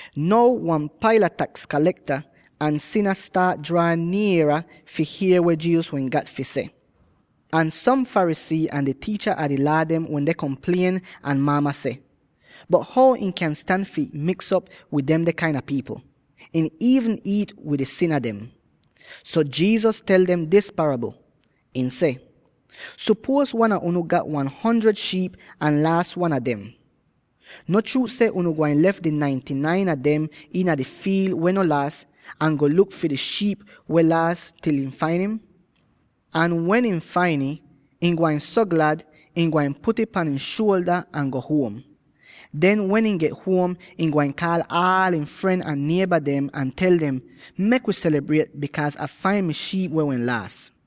Now wan paila taks kalekta, ahn sina staat draa nier fi hier weh Jesus wehn gat fi seh. Ahn som Pharisee ahn di tiicha a di Laa dem wende komplien ahn maama seh, “Bot how ihn kyan stan fi miks'op wid demde kain a pipl; ihn iivn iit wid di sina dem.” So Jesus tel dem dis parabl; ihn seh: “Sopuoz wan a unu gat wan hundred shiip ahn laas wan a dem. No chruut seh ihn gwain lef di ninety-nine a dem weh no laas iina di fiil, ahn go luk fi di shiip weh wehn laas til ihn fain ih? Ahn wen ihn fain ih, ihn gwain so glad so ihn gwain put'ih pan ihn shuolda ahn go huom. Den, wen ihn get huom, ihn gwain kaal aal ihn fren ahn nieba dem ahn tel dem, ‘Mek wi selibriet, bikaaz Ah fain mi shiip weh wehn laas.’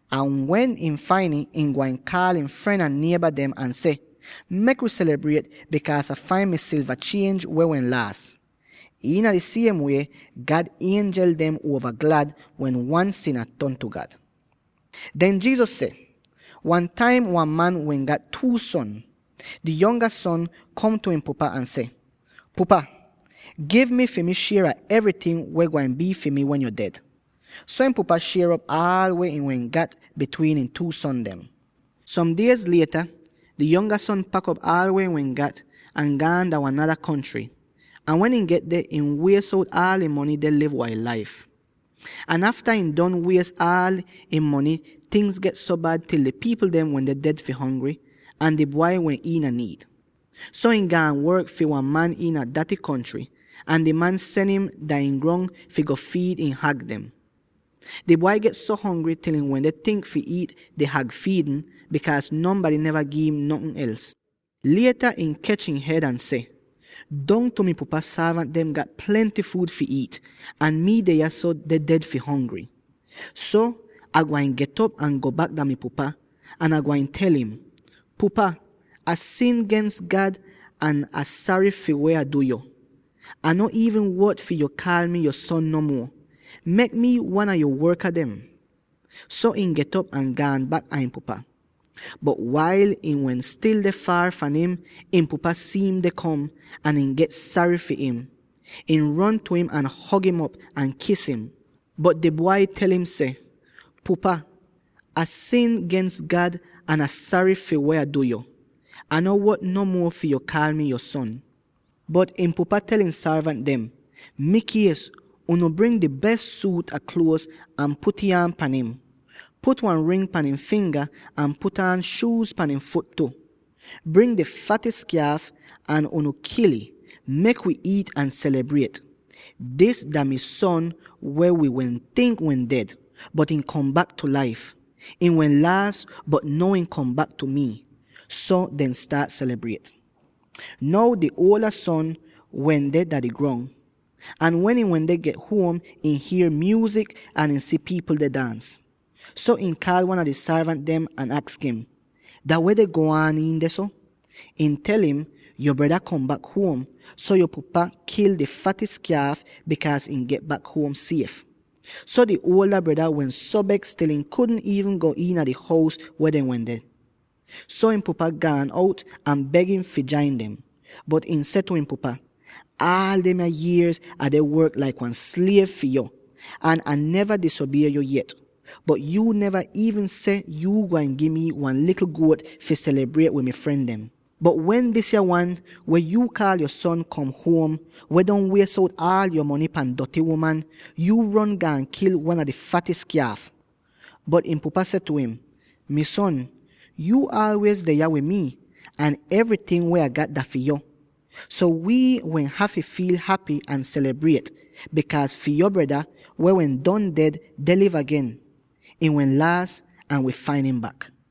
Ahn wen ihn fain ih, ihn gwain kaal ihn fren ahn nieba dem ahn seh, ‘Mek wi selibriet, bikaaz Ah fain mi silva chienj weh wehn laas.’ Iina di siem wie, God ienjel dem uova glad wen wan sina ton tu God.” Den Jesus seh, “Wan taim wan man wehn gat two son. Di yonga wan kom tu ihn pupa ahn seh, ‘Pupa, gi mi fi mi shier a evryting weh gwain bii fi mi wen yo ded.’ So ihn pupa shier op aal weh ihn wehn gat bitwiin ihn two son dem. Som diez lieta, di yonga son pak'op aal weh ihn wehn gat, ahn gaan dah wan nada kontry, ahn wen ihn get deh, ihn wies out aal ihn mony deh liv wail laif. Ahn afta ihn don wies aal ihn mony, tingz get so bad til di pipl dem wende ded fi hongry, ahn di bwai wehn iina niid. So ihn gaan work fi wan man iina daty kontry, ahn di man sen im dah ihn grong fi go fiid ihn hag dem. Di bwai get so hongry til ihn wende tink fi iit di hag fiidn, bikaaz nonbady neva gi'im notn els. Lieta ihn kech ihn hed ahn seh, ‘Dongtu mi pupa sorvant dem gat plenty fuud fi iit, ahn mi deh yahso deh ded fi hongry. So, Ah gwain get'op ahn go bak dah mi pupa, ahn Ah gwain tel im: “Pupa, Ah sin gens God ahn Ah sary fi weh Ah du yo. Ah no iivn wot fi yo kaal mi yo son no muo; mek mi wan a yo worka dem.” ’ So ihn get'op ahn gaan bak dah ihn pupa. “Bot wail ihn wehn stil deh faar fahn im, ihn pupa si'im deh kom, ahn ihn get sary far im. Ihn ron tu im ahn hog'im op, ahn kis im. Bot di bwai tel im seh, ‘Pupa, Ah sin gens God ahn Ah sary fi weh Ah du yo. Ah no wot no muo fi yo kaal mi yo son.’ Bot ihn pupa tel di sorvant dem, ‘Mikies, unu bring di bes suut a kluoz ahn put'ih aan pan im. Put wan ring pan ihn finga ahn put aan shuuz pan ihn fut tu. Bring di fatis kyaaf, ahn unu kil'ih; mek wi iit ahn selibriet. Dis dah mi son weh wi wehn tink wehn ded, bot ihn kom bak tu laif! Ihn wehn laas, bot now ihn kom bak tu mi.’ So dehn staat selibriet. “Now di uolda son wehn deh dah di grong. Ahn wen ihn wende get huom, ihn hier myuuzik ahn ihn si pipl deh daans. So ihn kaal wan a di sorvant dem ahn aks im, ‘Dah weh deh go aan iin dehso?’ Ihn tel im, ‘Yo breda kom bak huom, so yo pupa kil di fatis kyaaf, bikaaz ihn get bak huom sief.’ So, di uolda breda wehn so beks til ihn wudn iivn go iina di hous weh dehn wende. So ihn pupa gaan out ahn beg im fi jain dem. Bot ihn seh tu ihn pupa, ‘Aal demya yierz Ah deh work laik wan sliev fi yo ahn Ah neva disobie yo yet. Bot yuu neva iivn seh yuu gwain gi mi wan likl guot fi selibriet wid mi fren dem. Bot wen disya wan —weh yuu kaal yo son— kom huom, weh don wies out aal yo mony pan doty uman, yuu ron gaan kil wan a di fatis kyaaf!’ “Bot ihn pupa seh tu im, ‘Mi son, yuu aalwiez deh yah wid mi, ahn evryting weh Ah gat dah fi yo. So wi wehn hafy get glad ahn selibriet, bikaaz yo breda, weh wehn don ded, deh liv agen. Ihn wehn laas ahn wi fain im bak!’”